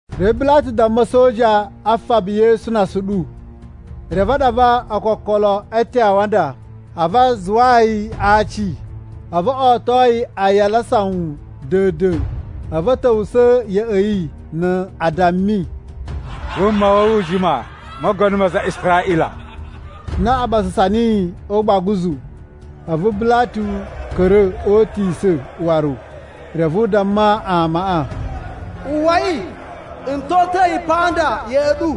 Reve Bilatu damma a̱soja a faba Yesu na asuɗu. Reve a ɗava ookokolo e eten a awanda, a̱vu a zuwayi a aaci, a̱vu o oto yi aayala a sawun da̱a̱n-da̱a̱n. A̱vu a̱ ta̱wusa̱ ya̱ꞌa̱ yi na a dammi, “Wuma wa̱ wu u jima, mogono ma aza a Israꞌila!” Na a ɓasasa niyi o ugbaguzu. A̱vu Bilatu ka̱ra̱ o utisa̱ waru, reve u damma amaꞌa, “Uwwai, n ta̱ o uta̱ yi pa nda ya̱ꞌa̱ ɗu,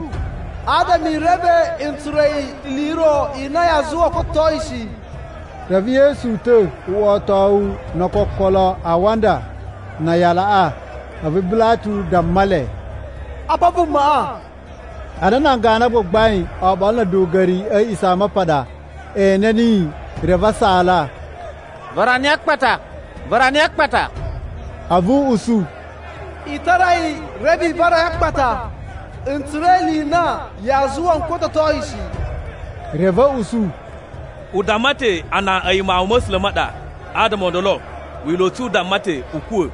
adama i reve n tsura̱ ili i ro i na yaa zuwa n kototo yi shi.” Reve Yesu uta̱, wotowu no ookokolo a awanda na aayalaꞌa. A̱vu Bilatu damma le, “Apa vumaꞌa!” Ana nan ganu a gbagbain oɓolo na̱ a̱duga̱ri a̱ A̱a̱ꞌisamapaɗa e ene niyi, reve a saala, “Vara niyi a akpata! Vara niyi a akpata!” A̱vu u usu, “I tara yi reve i vara yi a akpata. N tsura̱ ili i na yaa zuwa n kototo yi shi.” Reve a̱ usu, “U damma ta̱ a na a̱yi Mawun ma̱ A̱sula̱ ma ɗa. Adama o ndolo, Wila̱ u tsu u damma ta̱ u kuwa̱.”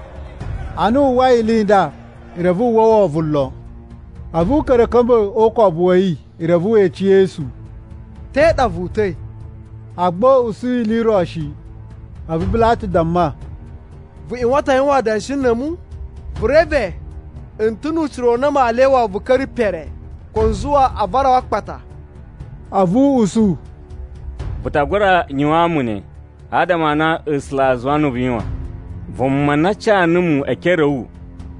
Ana wu uwwai ili i nda, reve wu uwwa wovon lon. A̱vu u ka̱ra̱ a̱ ka̱mba̱ o ukobu wa̱ yi reve we ece Yesu, “Te ɗa vu uta̱i?” Agba u usu ili i ro shi. A̱vu Bilatu damma, “Vu ꞌyuwan ta̱ a yuwan adanshi na̱ a̱mu? Vu reve, n ta̱ nu ucira u na maa lyawa wu vu ka̱ra̱ pere, ko n zuwa a vara wu a akpata.” A̱vu u usu, “Vu ta gura yuwaan mu ne adama a na A̱sula̱ a zuwa nuwu vu yuwan. Vuma na ca numu e ekere a̱ wu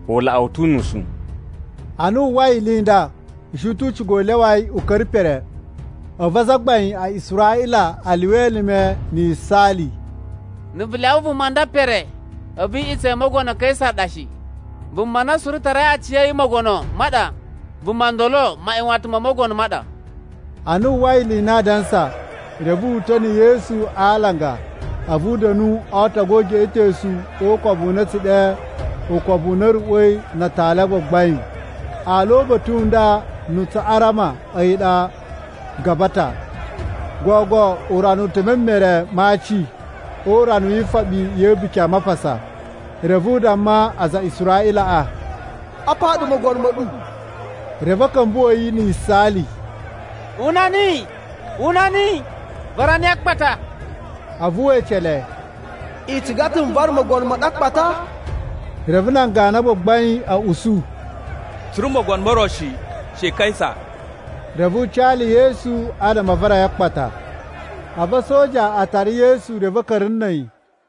u laꞌa wu ta̱ unusu.” Ana wu uwwai ili i nda, u shi ta̱ u ciga u lyawa yi u ka̱ra̱ pere. A̱vu azagbain a Israꞌila a lyuwa elime na̱ yisaali, “Na̱ vu lyawa vuma nda pere, a̱vu iꞌutsa̱ i Mogono Kaisa ɗa shi! Vuma na suru tarai aciya̱yi mogono ma ɗa, vuma ndolo maꞌyuwatan mo mogono ma ɗa!” Ana wu uwwai ili i na aa dansa, reve wu uta̱ na̱ Yesu a alanga a̱vu u da̱nu o ootogu o ugeꞌetosu o ukobu u na a̱ tsu ɗe Ukobu u na a̱ Ruꞌwa̱i na Atali a Gbagbain. (Aala o uba̱ta̱ u nda na̱ Tsuꞌarama a̱yi ɗa “Gabata.”) Gogo urana u ta̱ e meremee ma aci o Urana wi Ifoɓi ya̱ A̱buki a Mapasa. Reve u damma aza a Israꞌilaꞌa, “Apa ɗu mogono ma̱ ɗu!” Reve a̱ ka̱mbuwa̱ yi na̱ yisaali, “Una niyi! Una niyi! Vara yi a akpata!” A̱vu we ece le, “I ciga ta̱ n vara mogono ma̱ ɗu a akpata?” Reve nan ganu a gbagbain a̱ usu, “Tsu ri na̱ mogono mo ro shi, she Kaisa!” Reve u ca le Yesu adama a vara yi a akpata. A̱vu a̱soja a tara Yesu reve a̱ ka̱ra̱ na̱ a̱yi.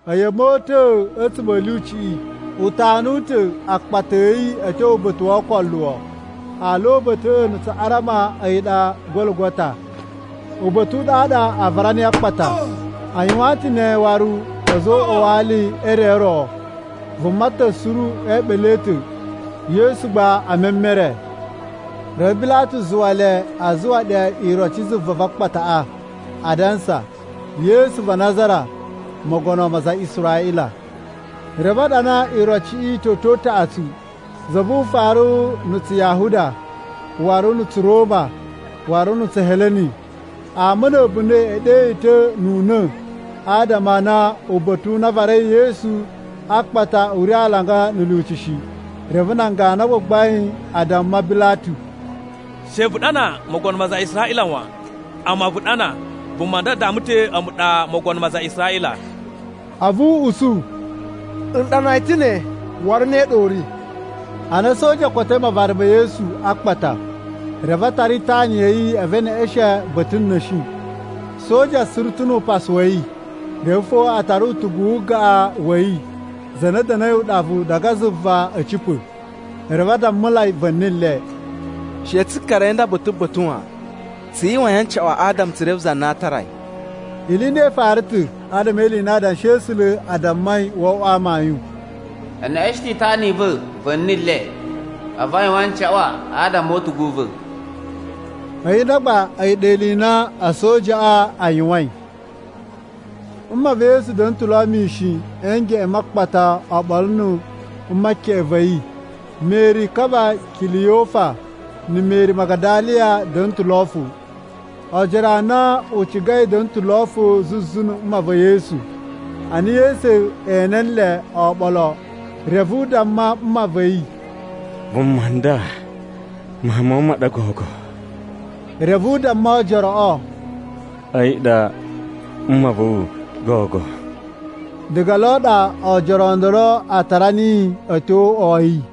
A̱yi a̱ mota̱a̱ a̱tsuma̱ a̱ lyuciꞌi, u tanu ta̱ akpata a̱ yi a̱ tyo Uba̱ta̱ wo Ookoluwo. (Aala o uba̱ta̱ꞌa̱ na̱ Tsuꞌarama a̱yi ɗa “Gologota”). Uba̱ta̱ u ɗaɗa a vara niyi a akpata. A yuwaan ta̱ ne waru a̱za̱ o uꞌwa wa ali e re o ro, vuma ta̱ suru e eeɓele a̱ ta̱, Yesu gba e memere. Reve Bilatu zuwa le a zuwa ɗe iroci zuva va a akpataꞌa, adansa, Yesu va Nazara, mogono ma aza a Israꞌila. Reve a ɗana irociꞌi toto utaꞌatsu: Za vu ufaru na̱ Tsuyahuda, waru na̱ Tsuroma, waru na̱ Tsuheleni. Ama na̱ a̱bunda̱ e ɗe yi ta̱ nu una̱, adama a na uba̱ta̱ u na a varai Yesu a akpata u ri alanga na̱ lyuci shi. Reve nan ganu a gbagbain a damma Bilatu, “She vu ɗana, ‘Mogono ma aza a Israꞌila’ wan, amma vu ɗana, ‘Vuma nda damma ta̱ a̱mu ɗa mogono ma aza a Israꞌila.’” A̱vu u usu, “N ɗana yi ta̱ ne, waru ne ɗa u ri.” Ana a̱soja o kotoi mavara ma̱ Yesu a akpata, reve a tara itana ya̱ yi a̱vu e neꞌeshen ba̱ta̱ na̱shi. Soja suru ta̱ nu upasu wa̱ yi. Reve fo a tara utugu wu ugaꞌan wa̱ yi, za na da̱na̱i uɗavu diga zuva a̱ cipa̱. Reve a dammulai va̱ni le, “She tsu karai a̱yi nda ba̱ta̱ ba̱ta̱ wan. Tsu yuwain ancaꞌwa adama tsu reve za na aa tara yi.” Ili i nda i fara ta̱ adama e ili i na Adanshi a̱ A̱sula̱ a dammai wo oꞌwo amayun: “E neꞌeshen ta̱ itana i va̱ va̱ni le, a̱vu a yuwan ancaꞌwa adama o utugu u va̱.” A̱yi nda gba, a̱yi ɗa ili i na a̱sojaꞌa a yuwain. Mma va̱ Yesu da̱na̱ ta̱ lo mishin a̱ ngeꞌen ma akpata oɓolo na̱ mma keꞌen va̱ yi. Meri ka va Kiliyofa na̱ Meri Magadaliya a̱ da̱na̱ ta̱ lo fo. Oojoro a na u cigai da̱na̱ ta̱ lo fo zuzu na̱ mma va̱ Yesu. Ana Yesu ene nle oɓolo, reve u damma mma va̱ yi, “Vuma nda mawun ma̱ wu ma ɗa gogo.” Reve u damma oojoroꞌo, “A̱yi ɗa mma va̱ wu gogo.” Diga lo ɗa oojoro o ndolo a tara niyi a̱ tyo o uꞌwa wa̱ yi.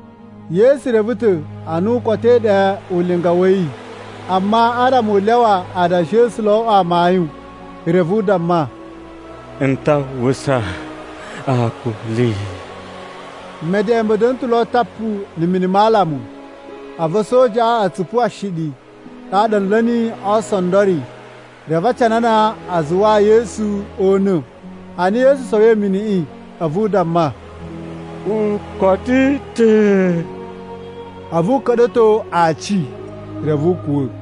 Yesu reve ta̱ a na u kotoi ɗe ulinga wa̱ yi. Amma adama u lyawa Adanshi a̱ A̱sula̱ o oꞌwo amayun, reve u damma, “N ta uwwusa akuli!” Meden ma̱ da̱na̱ ta̱ lo tapu na̱ mini ma alamu, a̱vu a̱sojaꞌa a̱ tsupu pe ashiɗi. Ɗaɗa a̱ nla̱ niyi o oosondori, reve a canana a zuwaa Yesu o una̱. Ana Yesu sowoi miniꞌi, a̱vu u damma, “U koto ta̱.” A̱vu u ka̱ɗa̱to aaci, reve u kuwa̱.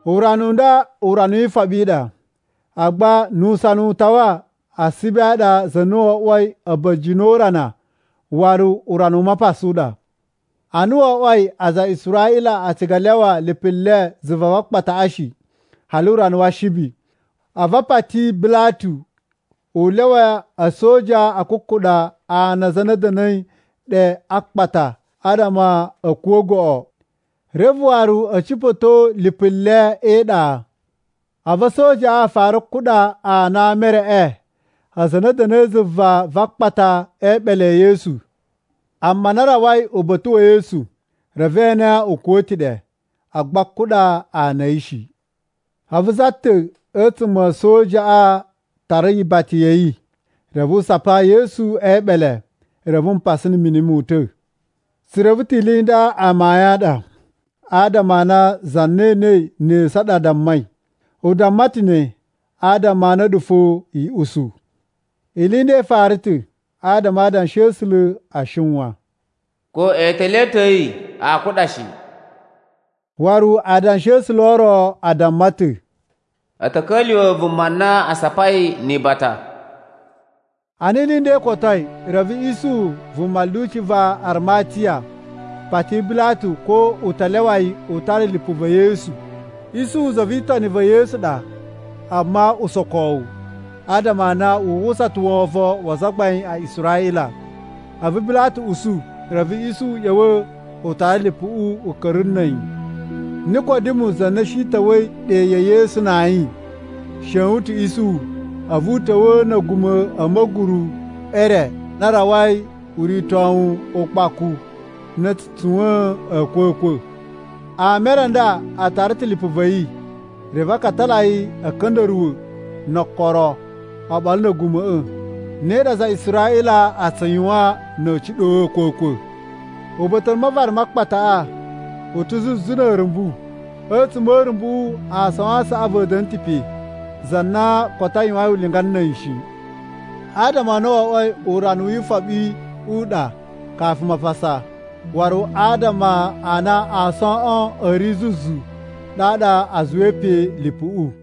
Urana u nda Urana wi Ifoɓi i ɗa, agba nu usana u tawa Ashibi a ɗa za na wo oꞌwoi a̱ba̱jini o urana waru Urana u Mapasa u ɗa. Ana wo oꞌwoi aza a Israꞌila a ciga a lyawa lipu le zuva va akpataꞌa shi hali urana wa Ashibi, a̱vu a pati Bilatu u lyawa a̱soja a kukuɗa ana a aza a na a̱ da̱na̱i ɗe a akpata adama a̱ kuwa̱ goꞌo. Reve waru a̱ cipa̱to lipu le e iɗa. A̱vu a̱sojaꞌa a fara kuɗa ana a ama e reꞌe aza a na a̱ da̱na̱i zuva va akpata e eɓele e Yesu. Amma ana a rawai uba̱ta̱ wa̱ Yesu, reve e ene u kuwa̱ ta̱ ɗe, agba a kuɗa ana a̱ yi shi. A̱vu za ta̱ a̱tsuma̱ a̱ a̱sojaꞌa tara ibata ya̱ yi reve u sapa Yesu e eeɓele. Reve mpasa na̱ mini mo uta̱. Tsu reve ta̱ ili i nda amayun a ɗa, adama a na za na enei ne esu ɗa dammai. U damma ta̱ ne adama a̱ɗu fo i usu. Ili i nda i fara ta̱ adama Adanshi a̱ A̱sula̱ a shiwan: “Ko eetele a̱ ta̱ a̱ yi aa kuɗa shi.” Waru Adanshi a̱ A̱sula̱ o ro a damma ta̱, “A̱ ta̱ ka̱lyuwa̱ vuma na a sapai ni ibata.” Ana ili i nda i kotoi, reve Isuhu, vuma lyuci va Arimatiya, pati Bilatu ko u ta lyawa yi u tara lipu va̱ Yesu. (Isuhu za vi itoni va̱ Yesu ɗa, amma usokowu, adama a na wu uwwusa ta̱ wovon wa azagbain a Israꞌila.) A̱vu Bilatu usu, reve Isuhu ꞌya̱wa̱ u tara lipuꞌu u ka̱ra̱ na̱ a̱yi. Nikodimu, za na shi ta̱wa̱i ɗe ya̱ Yesu na ayin, shewun ta̱ Isuhu. A̱vu u ta̱wa̱a̱ na̱ a̱guma̱ a̱ ma̱guru e re na rawai uritowu ukpaku na a̱ tsu tsuwa̱a̱n a̱a̱kwa̱kwa̱. Ama e re a nda a tara ta̱ lipu va̱ yi reve a katala yi a̱ka̱nda̱ruwa̱ no okoro oɓolo na̱ a̱guma̱ꞌa̱. Ne ɗa aza a Israꞌila a tsu yuwan na̱ a̱a̱ ciɗo a̱a̱kwa̱kwa̱. Uba̱ta̱ u mavara ma akpataꞌa u ta̱ zuzu na̱ a̱a̱rumbu, a̱tsuma̱ a̱ a̱a̱rumbuꞌu aason a saꞌavu a̱ da̱na̱ ta̱ pe za na koto a yuwain ulinga na̱ a̱yi shi. Adama a na wo oꞌwoi Urana wi Ifoɓi u ɗa kafu Mapasa, waru adama a na aasoꞌon a̱ ri zuzu, ɗaɗa a zuwai pe lipuꞌu.